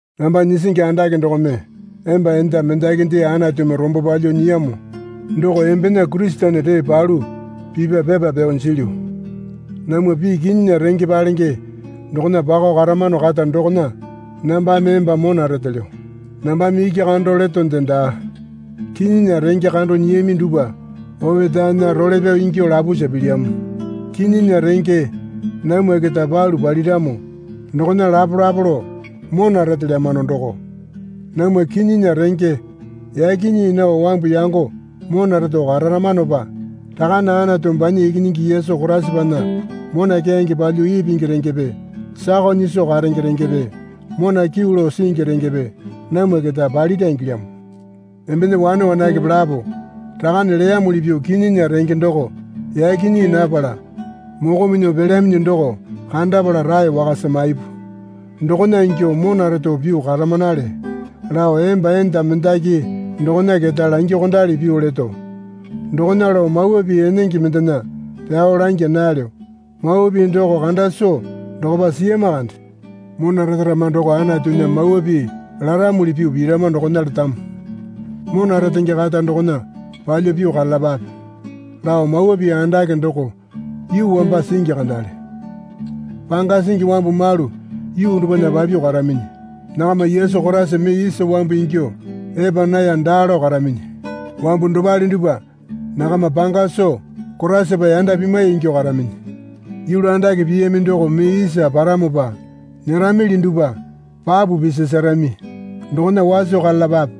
Namba nyisingi andake dokome emba enda mendakinde Anatumi rombo palyuo nyiyamo doko embena Kurisene ree palu pipya pepa pyao jilyu. Namwa pii kinyinya renge palenge dokona pakao karamano kata dokona nambame emba mona retelyo. Nambame iki kando letonde daa. Kinyinya renge kando nyiyami dupwa opetaena role pyao ingyuo lapusa pilyamo. Kinyinya renge namwa keta palu paliramo dokona lapolapo lao mona retelyamano doko. Namwa kinyinya renge yaki nyii nao wambu yango mona reto kararamanopa Rakane Anatu banya Ikinyingi Yesu Koraisapana mona keyange palyuo ipingi rengepe sakao nyiso karenge rengepe mona kyuu lao singi rengepe namwa keta palira ingilyamo. Embena wane wanakepe lapo Rakane leyamuli pyuo kinyinya renge doko yaki nyii napala moko minyuo pelyaminyi doko kandapala rae wakasa maipu. Dokona ingyuo mona reto pyuo karamanale lao emba enda mendaki dokona keta langyuokondali pyuo leto. Dokona lao mawa pii enenge mendena pyao langya nalyo. Mawa pii doko kanda soo dokopa siyama kande. Mona retarama doko Anatunya mawa pii laramuli pyuo pirama dokona letamo. Mona retenge kata dokona palyuo pyuo karalapape lao mawa pii andake doko yuu wamba singi kandale. Panga singi wambu malu yuu dupwana papyuo karaminyi. Nakama Yesu Koraisa mee isa wambu ingyuo epa naya daa lao karaminyi. Wambu dopale dupwa nakama panga soo Koraisapa yanda pimwai ingyuo karaminyi. Yulu andake piyami doko mee isa paramopa nyeramili dupwa papu pisasarami dokona waso karalapape.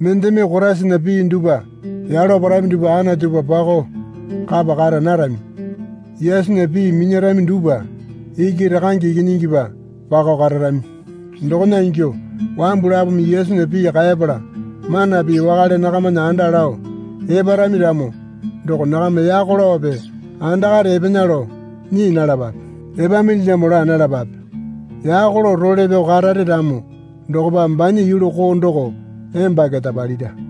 Mendeme Koraisana pii dupwa yalo parami dupwa Anatupa pakao kapa kara narami. Yesunya pii minyarami dupwa iki Rakange Ikinyingipa pakao kararami. Dokona ingyuo wambu lapome Yesunya pii kaepala mana pii wakale nakamana anda lao eparami ramo doko nakama yako laope andakare epena lao nyii nalapape. Epaminilyamo laa nalapape. Yako lao role pyao karare ramo dokopa banya yulu koo doko emba keta palira.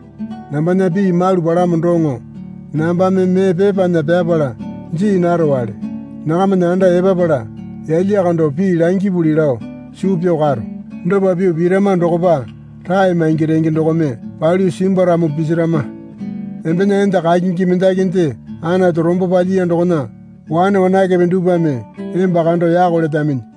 Nambana pii malu palamo doŋo nambame mee pepana pyapala jii narowale. Nakamana anda epapala yalya kando pii langipuli lao suu pyao karo. Dopa pyuo pirama dokopa rae maingi renge dokome palyuo simbwaramo pisarama. Embena enda kakingi mendakinde Anatu rombo palyiya dokona wane wanakepe dupwame emba kando yako letaminyi.